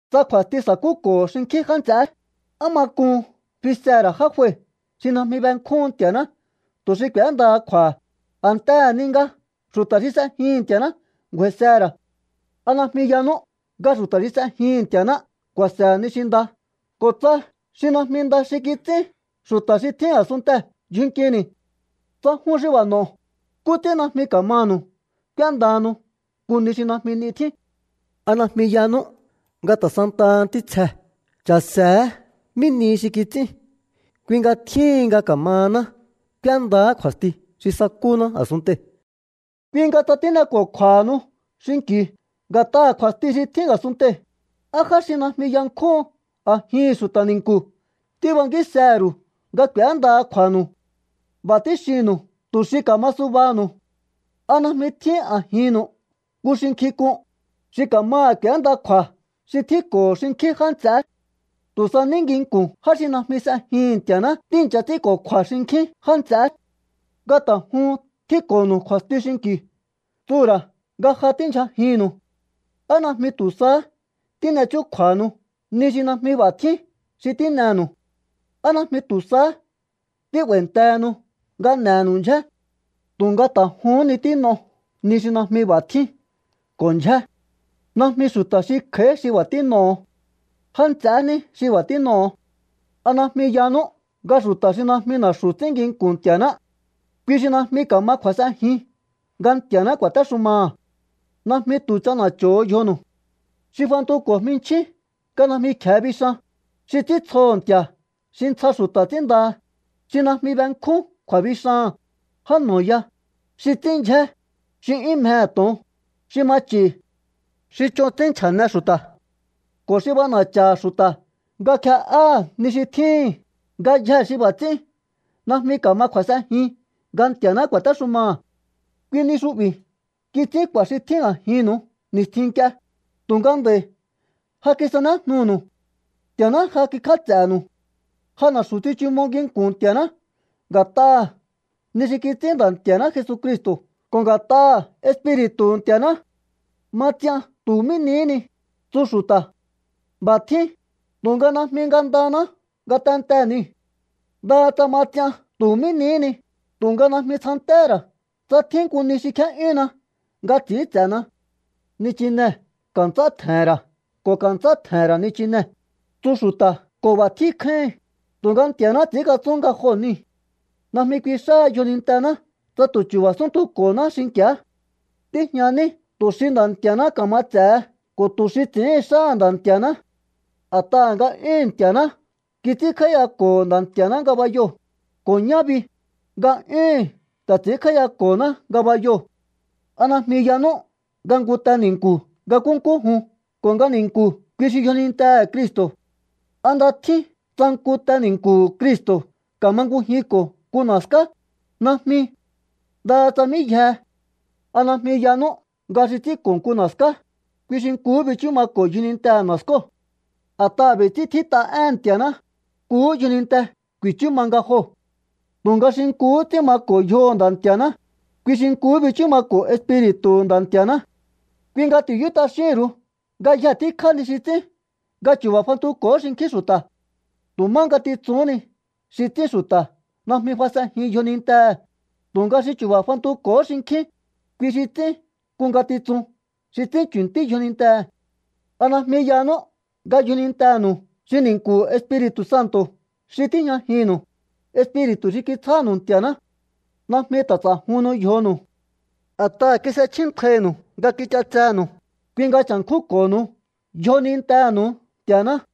Tsa kju̱a̱sti sa̱kúko̱ho̱ xinkjín já nts'eé, ¿á ma k'un fisehe̱ ra̱ já jue xi najmi benkjúhun Nti̱a̱ná tu̱ xi k'úéndaha kju̱a̱ha̱, a̱ntehe̱ ni nga xu̱ta̱ xi s'ejihi̱n Nti̱a̱ná ngu̱a̱i̱sehe̱ ra̱? ¿A najmi yanú nga xu̱ta̱ xi s'ejihi̱n Nti̱a̱ná ku̱a̱se̱he̱ ni xi nda ko̱ tsa xi najmi nda xi kits'ín xu̱ta̱ xi tjín a̱sunntee̱ ndyjun nkini̱? Tsa jun xi b'a̱ n'o̱o, ¿nkú ts'ín najmi ka̱manu̱u k'úéndahanu nku ni xi najmi 'ni tjín? ¿A najmi yanú nga ta̱ santaha ntítsjee̱ cha̱se̱éhe̱ mí nihi xi kits'ín? Kui nga tjíhin nga ka̱mahaná k'úéndaá kju̱a̱sti xi sakúná a̱sunntei̱. Kui nga tsa tín'eko̱kju̱a̱hanu xinki̱u nga̱t'aha̱ kju̱a̱sti xi tjín a̱sunntei̱, ¿á já xi najmi yankjúhun a̱jihi̱n xu̱ta̱ ni̱nku̱ tíbankísehe̱ ru̱u nga k'u̱éndaha kju̱a̱nu̱u? B'a̱ tíxinnu̱u tu̱ xi ka̱ma subaha̱nu̱u. ¿A najmi tjíhin a̱jinnu̱u nku xi nkjink'un, xi ka̱maha̱ k'u̱énda kju̱a̱ xi tjínko̱ho̱ xinkjín já nts'eé? Tu̱ sa ní nginku̱n já xi najmi s'ejihi̱n Nti̱a̱ná tíi̱ncha ts'ínko̱kju̱a̱ xinkjín já nts'eé. Nga ta̱ juhun tjínko̱nu̱u kju̱a̱sti xinki̱u tsuhu̱ ra̱ nga ja tíndyjajinnu̱u. ¿Á najmi tu̱ sahá tín'e chúkju̱a̱hanu ni xi najmi b'a̱ tjín xi tín'enu̱u? ¿Á najmi tu̱ sahá tí'ba̱i̱ntehenu nga n'e̱he̱nu̱u ndyjé? Tu̱nga ta̱ juhún ni tín'o ni xi najmi b'a̱ tjín ko̱ ndyjé. Najmi xu̱ta̱ xi kj'a̱í xi b'a̱ tín'oho̱. Já nts'ehé ní xi b'a̱ tín'oho̱. ¿A najmi yanú nga xu̱ta̱ xi najmi na̱xu̱ ts'ín nginku̱n Nti̱a̱ná, kui xi najmi ka̱ma kju̱a̱s'enjin nga Nti̱a̱ná ku̱a̱téxumaha̱? Najmi tu̱ ch'ana̱cho̱ho̱ yjonu̱u. Xi fantuko̱ jminchjín nga najmi kje̱e bixan, xi ts'íntsjoho̱ nti̱a̱ xi ntsja xu̱ta̱ ts'ínndaha, xi najmi benkjún kju̱a̱bixaha̱n, já no̱ ya, xi ts'ín ndyjé, xi 'yún mjehe̱ to̱on, xi ma ch'i̱, xi ch'on ts'ín nchja̱ne xu̱ta̱, ko̱ xi b'ana̱cha̱ha̱ xu̱ta̱ nga kje'áha̱ ni xi tjíhi̱n, ngayjee̱ xi b'a̱ ts'ín najmi ka̱ma kju̱a̱s'enjin nga Nti̱a̱ná ku̱a̱téxumaha̱. Kui ni xu'bi̱ kits'ín k'u̱a̱ xi tjín a̱jinnu̱u ni̱stjin nk'ie, tu̱nga nd'a̱i̱ ja kisanéjnunu̱u. Nti̱a̱ná ja kikj'áts'e̱nu̱u. Ja na̱xu̱ tsichumo nginku̱n Nti̱a̱ná nga̱t'aha̱ ni xi kits'ín Nda̱ Nti̱a̱ná Jesucristo̱ ko̱ nga̱t'aha̱ Espiri̱tu̱hu̱ Nti̱a̱ná. “Ma ts'ian tu̱ mí nihí ni”, tsu xu̱ta̱. B'a̱ tjín, tu̱nga najmi ngandanáá ngatentee̱ niu̱. Ndaha tsa ma ts'ian tu̱ mí nihí ni, tu̱nga najmi tsjantéhé ra̱ tsa tjín nku ni xi kjé'yúnna nga ts'i̱ínts'e̱na. “Nichinee̱ ka̱nts'á tje̱he̱n ra̱ ko̱ ka̱nts'á tje̱he̱n ra̱ nichinee̱”, tsu xu̱ta̱ ko̱ b'a̱ tjín kjáíhin, tu̱nga Nti̱a̱náhá ts'i̱ínkatsún nga joo̱ niu̱. Najmi kui xáha̱ yjonintená tsa tu̱ chu̱ba̱ súnntuko̱náá xinki̱á. Tíjña ní tu̱ xi Nda̱ Nti̱a̱ná ka̱ma ts'e̱he ko̱ tu̱ xi ts'i̱íhin xáha̱ Nda̱ Nti̱a̱ná. A̱t'aha̱ nga'yúhu̱n Nti̱a̱ná kits'ínkj'áíyako̱ho Nda̱ Nti̱a̱ná ngabayoo̱, ko̱ ñá bi, nga'yúhu̱n ta̱ ts'i̱ínkj'áíyako̱ná ngabayoo̱. ¿A najmi yanú nga nku te ni̱nku̱ nga nkúnkú jun ko̱ nga ni̱nku̱ kui xi yjonintehe̱ Cristo̱? ¿A nda tjín tsa nku te ni̱nku̱hu̱ Cristo̱ ka̱mangujinko̱ nku na̱ská? Najmi. Ndaha tsa mí yjehe. ¿A najmi yanú nga xi ts'ínko̱ nku na̱ská, kui xi nkuhú bichú mako̱ yjonintehe̱ na̱skóo̱? A̱t'aha̱ b'i̱ ts'ín tjít'a éhe̱n Nti̱a̱ná: “Nkuhú yjoninte ku̱i̱chú ma nga joo̱.” Tu̱nga xi nkuhú ts'ín mako̱ yjoho̱ Nda̱ Nti̱a̱ná, kui xi nkuhú bichú mako̱ Espiri̱tu̱hu̱ Nda̱ Nti̱a̱ná. Kui nga ti̱yú t'axíhi̱n ru̱u ngayje tíkjá ni xi ts'ín nga chu̱ba̱ fantuko̱hó xinkjín xu̱ta̱. Tu̱ má ngatitsuhún ni xi ts'ín xu̱ta̱ najmi fas'enjin yjonintehe̱, tu̱nga xi chu̱ba̱ fantuko̱hó xinkjín, kui xi ts'ín nku ngatitsun xi ts'ín chu̱ntí yjonintehe̱. ¿A najmi yanú nga yjonintenu̱u xi ni̱nku̱hu̱ Espiri̱tu̱ Santo̱ xi tíjñajinnu̱u, Espiri̱tu̱ xi kitsjánu̱u Nti̱a̱ná? Najmi ta̱ ts'a̱juhunnu yjonu̱u. A̱t'aha̱ kis'echjíntjainu̱u nga kich'atsenu̱u. Kui nga cha̱nkjúnko̱honu yjonintenu̱u Nti̱a̱ná.